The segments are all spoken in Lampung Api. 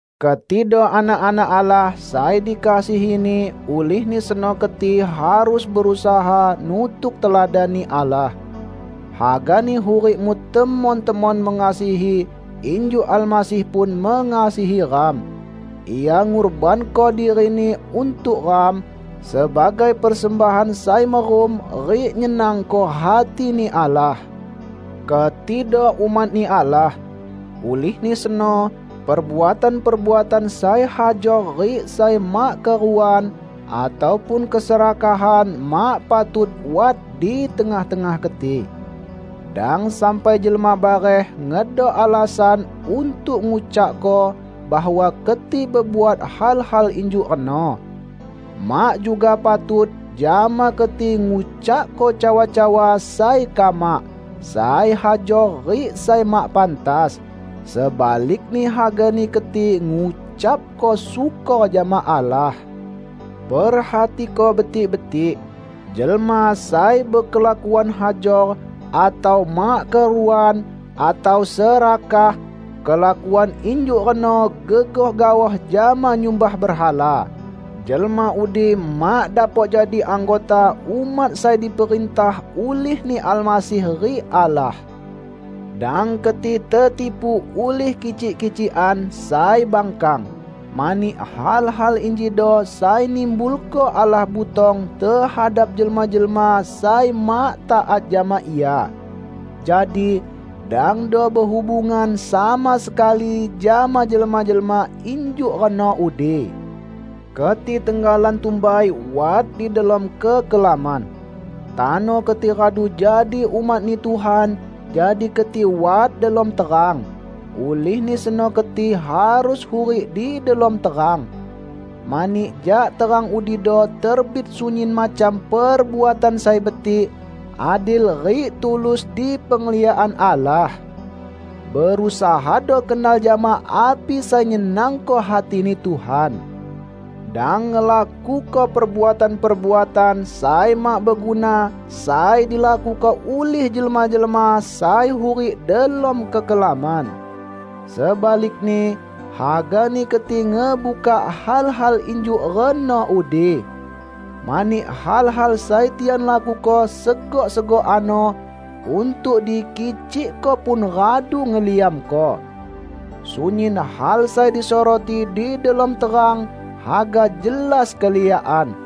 Ketido anak-anak Allah sai dikasihi-Ni, ulihni seno keti harus berusaha nutuk teladan-Ni Allah. Hagani hurikmu temon-temon mengasihi injuk Almasih pun mengasihi ram. Ia ngurbanko diri-Ni untuk ram, sebagai persembahan sai merum rik nyenangko hati-Ni Allah. Ketido umat-Ni Allah. Ulihni seno, perbuatan-perbuatan sai hajor rik sai mak keruan, ataupun keserakahan mak patut wat di tengah-tengah keti. Dang sampai jelma bareh ngedok alasan untuk ngucakko bahwa keti bebuat hal-hal injuk reno. Mak juga patut jama keti ngucakko cawa-cawa sai kamak, sai hajor rik sai mak pantas. Sebalikni hagani keti ngucapko syukor jama Allah. Perhatiko betik-betik: jelma sai bekelakuan hajor, atau mak keruan, atau serakah (kelakuan injuk reno gegoh gaoh jama nyumbah berhala), jelma udi mak dapok jadi anggota umat sai diperintah ulih-Ni Almasih rik Allah. Dang keti tetipu ulih kicik-kicikan sai bangkang. Mani hal-hal injido sai nimbulko Allah butong tehadap jelma-jelma sai mak taat jama Ia. Jadi, dangdo behubungan sama sekali jama jelma-jelma injuk reno udi. Keti tenggalan tumbai wat di delom kekelaman. Tano keti radu jadi umat-Ni Tuhan, jadi keti wat delom terang. Ulihni seno keti harus hurik di delom terang. Mani jak terang udido terbit sunyin macam perbuatan sai betik, adil rik tulus di pengliakan Allah. Berusahado kenal jama api sai nyenangko hati-Ni Tuhan. Dang ngelakuko perbuatan-perbuatan sai mak beguna sai dilakuko ulih jelma-jelma sai hurik delom kekelaman. Sebalikni, hagani keti ngebukak hal-hal injuk reno udi. ( Mani hal-hal sai tian lakuko segok-segok ano, untuk dikicikko pun radu ngeliamko.) Sunyin hal sai disoroti di delom terang haga jelas keliakan.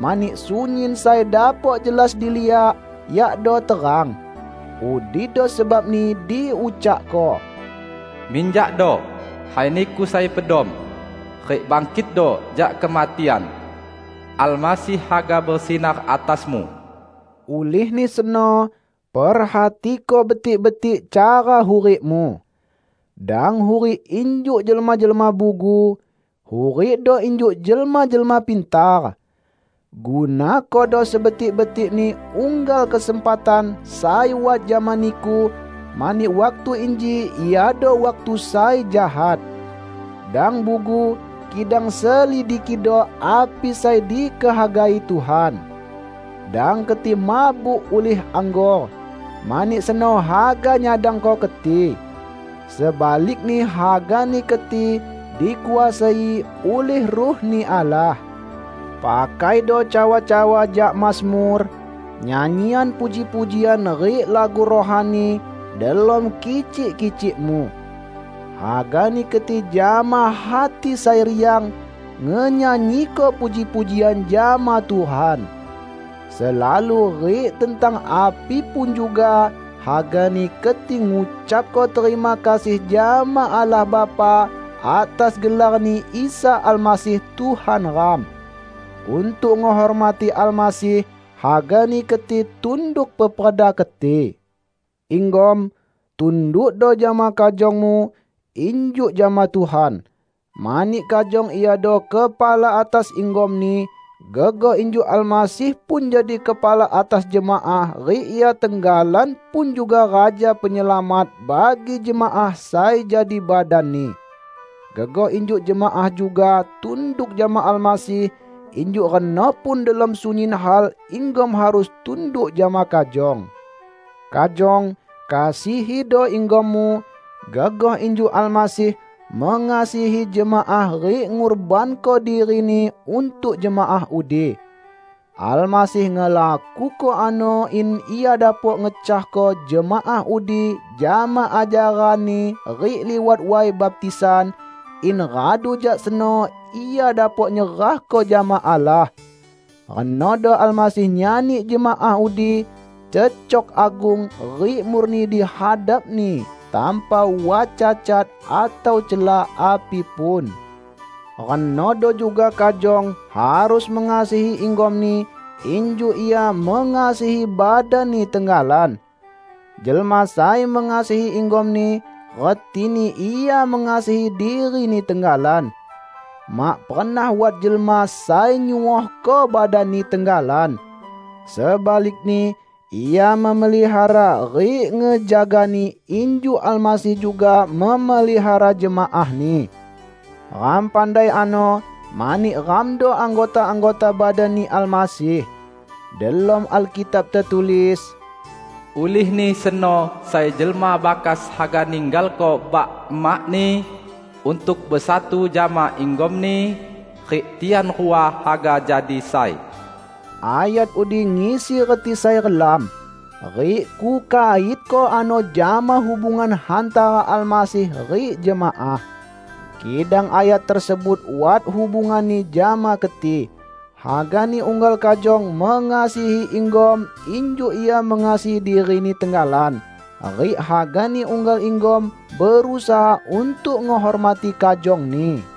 Mani sunyin sai dapok jelas diliak, yakdo terang. Udido sebabni diucakko, "Minjakdo, hai niku sai pedom, rik bangkitdo jak kematian! Almasih haga besinar atasmu." Ulihni seno, perhatiko betik-betik cara hurikmu. Dang hurik injuk jelma-jelma bugu; hurikdo injuk jelma-jelma pintar. Gunakodo sebetik-betikni unggal kesempatan sai wat jama niku, mani waktu inji iado waktu sai jahat. Dang bugu, kidang selidikido api sai dikehagai Tuhan. Dang keti mabuk ulih anggor, mani seno haga nyadangko keti. Sebalikni hagani keti dikuasai ulih Ruh-Ni Allah. Pakaido cawa-cawa jak mazmur, nyanyian puji-pujian rik lagu rohani, delom kicik-kicikmu. Hagani keti jama hati sai riang ngenyanyiko puji-pujian jama Tuhan. Selalu rik tentang api pun juga, hagani keti ngucapko terima kasih jama Allah Bapa, atas gelar-Ni Isa Almasih Tuhan ram. Untuk ngehormati Almasih, hagani keti tunduk peperda keti. Inggom, tundukdo jama kajongmu, injuk jama Tuhan. Mani kajong iado kepala atas inggomni, gegoh injuk Almasih pun jadi kepala atas jemaah rik Ia tenggalan pun juga Raja Penyelamat bagi jemaah sai jadi badan-Ni. Gegoh injuk jemaah juga tunduk jama Almasih, injuk reno pun delom sunyin hal inggom harus tunduk jama kajong. Kajong, kasihido inggommu, gegoh injuk Almasih mengasihi jemaah rik ngurbanko diri-Ni untuk jemaah udi. Almasih ngelakuko ano in Ia dapok ngecahko jemaah udi jama ajaran-Ni rik liwat way baptisan, in radu jak seno Ia dapok nyerahko jama Allah. Renodo Almasih nyani jemaah udi cecok agung rik murni di hadap-Ni tanpa wat cacat atau cela api pun. Renodo juga kajong harus mengasihi inggomni injuk ia mengasihi badanni tenggalan. Jelma sai mengasihi inggomni retini ia mengasihi dirini tenggalan. ( Mak pernah wat jelma sai nyuohko badanni tenggalan. Sebalikni, ia memelihara rik ngejagani injuk Almasih juga memelihara jemaah-Ni. Ram pandai ano, mani ramdo anggota-anggota badan-Ni Almasih.) Delom Alkitab tetulis, "Ulihni seno sai jelma bakas haga ninggalko bak-emakni untuk besatu jama inggomni, rik tian rua haga jadi sai." Ayat udi ngisi reti sai relam. Rik kukaitko ano jama hubungan hantara Almasih rik jemaah. Kidang ayat tersebut wat hubunganni jama keti: Hagani unggal kajong mengasihi inggom injuk ia mengasihi dirini tenggalan rik hagani unggal inggom berusaha untuk ngehormati kajongni.